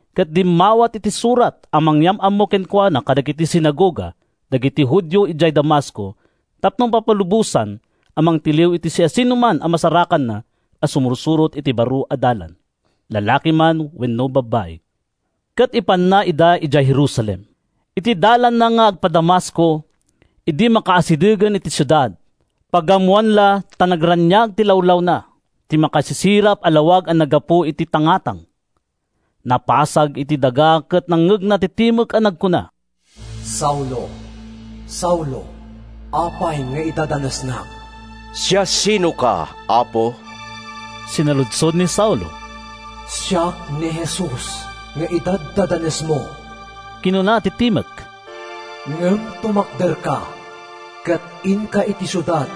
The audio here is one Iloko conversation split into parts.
ket dimmawat iti surat a mangyam-ammo kenkuana kadagiti sinagoga dagiti Judio idiay Damasco tapno mapalubosan a mangtiliw iti siasinoman a masarakanna a sumursurot iti Baro a Dalan, lalaki man wenno babai, ket ipanna ida idiay Jerusalem. Iti dalanna nga agpa-Damasco, idi makaasidegen iti siudad, pagammoan la ta nagraniag ti lawlawna iti makasisirap a lawag a naggapu iti tangatang. Napasag iti daga ket nangngegna ti timek a nagkuna, “Saulo, Saulo, apay nga idadanesnak?” “Siasinoka, Apo?” sinaludsod ni Saulo. “Siak ni Jesus nga idaddadanesmo,” kinuna ti timek. “Ngem tumakderka, ket inka iti siudad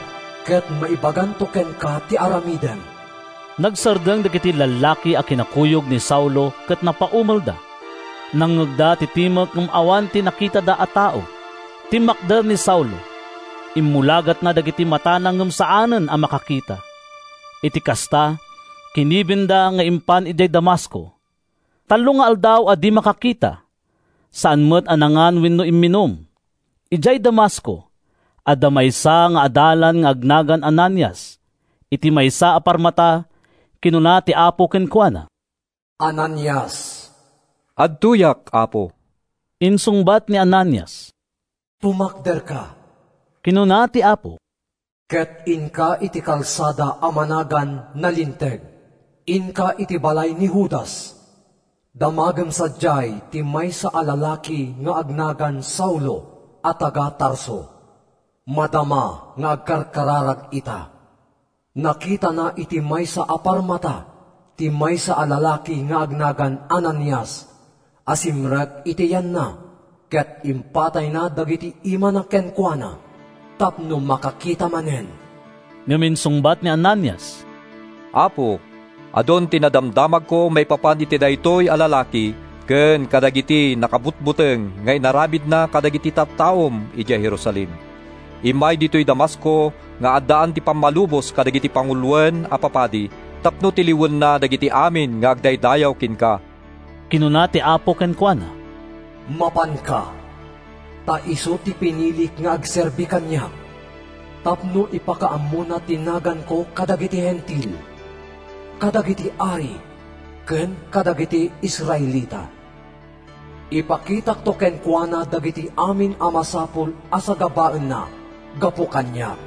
ket maibaganto kenka ti aramidem.” Nagsardeng dagiti lallaki a kinakuyog ni Saulo ket napaumelda. Nangngegda ti timek ngem awan ti nakitada a tao. Timmakder ni Saulo, immulagatna dagiti matana ngem saanen a makakita. Iti kasta, kinibinda nga impan idiay Damasco. Tallo nga aldaw a di makakita. Saan met a nangan wenno imminum. Idiay Damasco, adda maysa nga adalan nga agnagan Ananias. Iti maysa a parmata, kinuna ti Apo kenkuana, “Ananias!” “Adtoyak, Apo,” insungbat ni Ananias. “Tumakderka,” kinuna ti Apo, “ket inka iti kalsada a managan Nalinteg. Inka iti balay ni Judas. Damagem sadiay ti maysa a lalaki nga agnagan Saulo a taga-Tarso. Madama nga agkarkararag ita. Nakitana iti maysa a parmata ti maysa a lalaki nga agnagan Ananias a simrek iti yanna ket impatayna dagiti imana kenkuana tapno makakita manen.” Ngem insungbat ni Ananias, “Apo, adun ti nadamdamagko maipapan iti daytoy a lalaki ken kadagiti nakabutbuteng nga inaramidna kadagiti tattaom idiay Jerusalem. Immay ditoy Damasco nga addaan pammalubos dagiti panguloen a papadi tapno tiliwenna dagiti amin nga agdaydayaw kenka.” Kinuna ti Apo kenkuana, “Mapanka, ta isu ti pinilik nga agserbi kaniak, tapno ipakaammona ti naganko kadagiti Hentil, kadagiti ari ken kadagiti Israelita. Ipakitakto kenkuana dagiti amin a masapul a sagabaenna gapu kaniak.”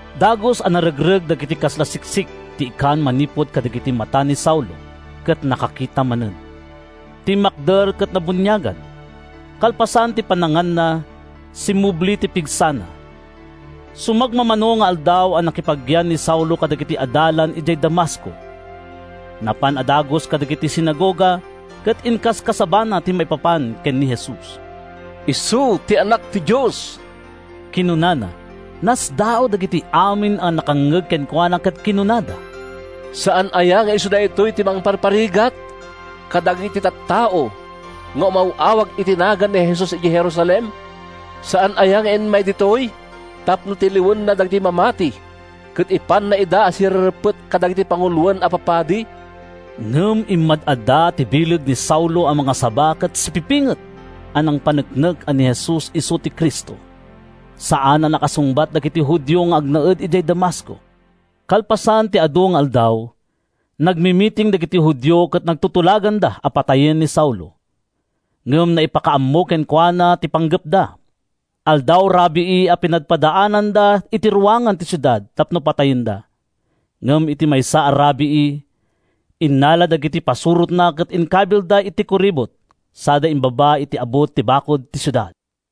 Dagus a naregreg dagiti kasla siksik ti ikan manipud kadagiti mata ni Saulo ket nakakita manen. Timmakder ket nabuniagan. Kalpasan ti pannanganna, simmubli ti pigsana. Sumagmamano nga aldaw a nakipagyan ni Saulo kadagiti adalan idiay Damasco. Napan a dagus kadagiti sinagoga ket inkaskasabana ti maipapan ken ni Jesus. “Isu ti Anak ti Dios,” kinunana. Nasdaaw dagiti amin a nakangngeg kenkuana ket kinunada, “Saan aya nga isu daytoy ti nangparparigat kadagiti tattao nga umaw-awag iti nagan ni Jesus idiay Jerusalem? Saan aya nga immay ditoy tapno tiliwenna dagiti mamati ket ipanna ida a sirereppet kadagiti panguloen a papadi?” Ngem immad-adda ti bileg ni Saulo a mangasaba ket sipipinget a nangpaneknek a ni Jesus isu ti Cristo. Saan a nakasungbat dagiti Judio nga agnaed idiay Damasco. Kalpasan ti adu nga aldaw, nagmimiting dagiti Judio ket nagtutulaganda a patayen ni Saulo. Ngem naipakaammo kenkuana ti panggepda. Aldaw-rabii a pinadpadaananda iti ruangan ti siudad tapno patayenda. Ngem iti maysa a rabii, innala dagiti pasurotna ket inkabilda iti kuribot sada imbaba iti abut ti bakud ti siudad.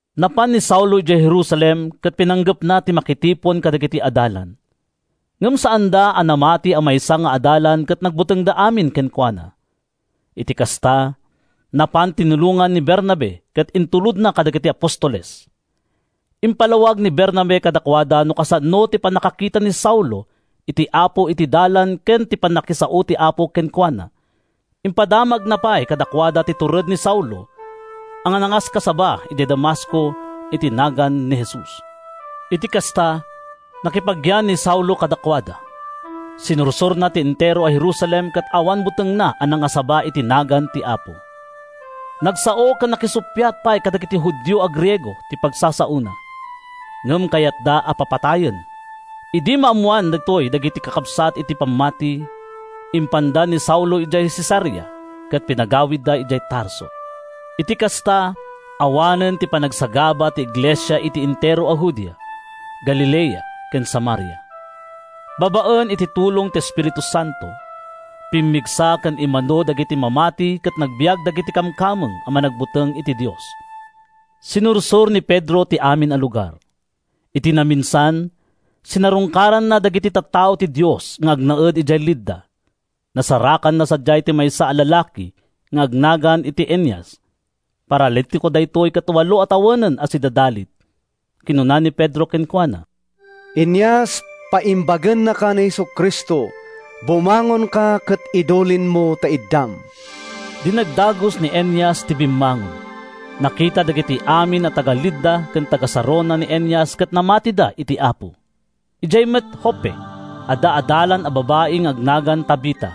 Napan ni Saulo idiay Jerusalem ket pinanggepna ti makitipon kadagiti adalan. Ngem saanda a namati a maysa nga adalan ket nagbutengda amin kenkuana. Iti kasta, napan tinulongan ni Bernabe ket intulodna kadagiti apostoles. Impalawag ni Bernabe kadakuada no kasano ti pannakakita ni Saulo iti Apo iti dalan ken ti pannakisao ti Apo kenkuana. Impadamagna pay kadakuada ti tured ni Saulo a nangaskasaba idiay Damasco iti nagan ni Jesus. Iti kasta, nakipagyan ni Saulo kadakuada. Sinursorna ti entero a Jerusalem ket awan butengna a nangasaba iti nagan ti Apo. Nagsao ken nakisuppiat pay kadagiti Judio a Griego ti pagsasaona, ngem kayatda a papatayen. Idi maammoan daytoy dagiti kakabsat iti pammati, impanda ni Saulo idiay Cesarea ket pinagawidda idiay Tarso. Iti kasta, awanen ti panagsagaba ti iglesia iti entero a Judea, Galilea ken Samaria. Babaen iti tulong ti Espiritu Santo, pimmigsa ken immadu dagiti mamati ket nagbiag dagiti kamkameng a managbuteng iti Dios. Sinursor ni Pedro ti amin a lugar. Iti naminsan, sinarungkaranna dagiti tattao ti Dios nga agnaed idiay Lidda. Nasarakanna sadiay ti maysa a lalaki nga agnagan iti Eneas. Paralitiko daytoy ket walo a tawenen a sidadalit. Kinuna ni Pedro kenkuana, “Eneas, paimbagennaka ni Jesu-Cristo. Bumangonka ket idulinmo ta iddam.” Dinagdagus ni Eneas ti bimmangon. Nakita dagiti amin a taga-Lidda ken taga-Sarona ni Eneas ket namatida iti Apo. Idiay met Joppe, adda adalan a babai nga agnagan Tabita.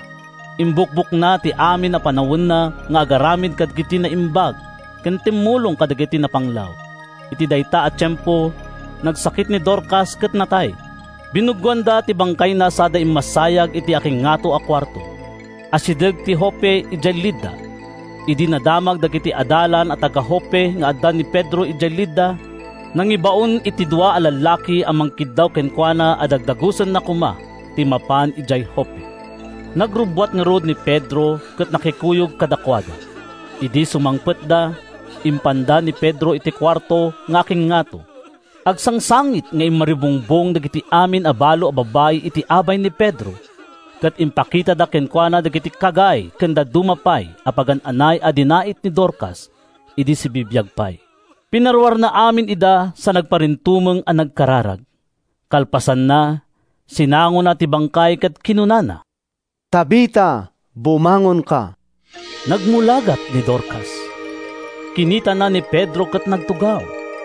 Imbukbokna ti amin a panawenna nga agaramid kadagiti naimbag ken tumulong kadagiti napanglaw. Iti dayta a tiempo nagsakit ni Dorcas ket natay. Binuggoanda ti bangkayna sada immassayag iti akingngato a kuarto. Asideg ti Joppe idiay Lidda. Idi nadamag dagiti adalan a taga-Joppe nga adda ni Pedro idiay Lidda, nangibaonda iti dua a lallaki a mangkiddaw kenkuana a dagdagusenna koma ti mapan idiay Joppe. Nagrubbuat ngarud ni Pedro ket nakikuyog kadakuada. Idi sumangpetda, impanda ni Pedro iti kuarto nga akingngato. Agsangsangit nga immaribungbong dagiti amin a balo a babbai iti abay ni Pedro ket impakitada kenkuana dagiti kagay ken dadduma pay a pagan-anay a dinait ni Dorcas idi sibibiag pay. Pinaruarna amin ida sa nagparintumeng a nagkararag. Kalpasanna, sinangona ti bangkay ket kinunana, “Tabita, bumangonka.” Nagmulagat ni Dorcas, kinitana ni Pedro ket nagtugaw.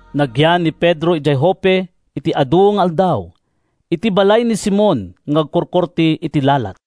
Nagyan ni Pedro idiay Joppe iti adu nga aldaw, iti balay ni Simon nga agkurkurte iti lalat.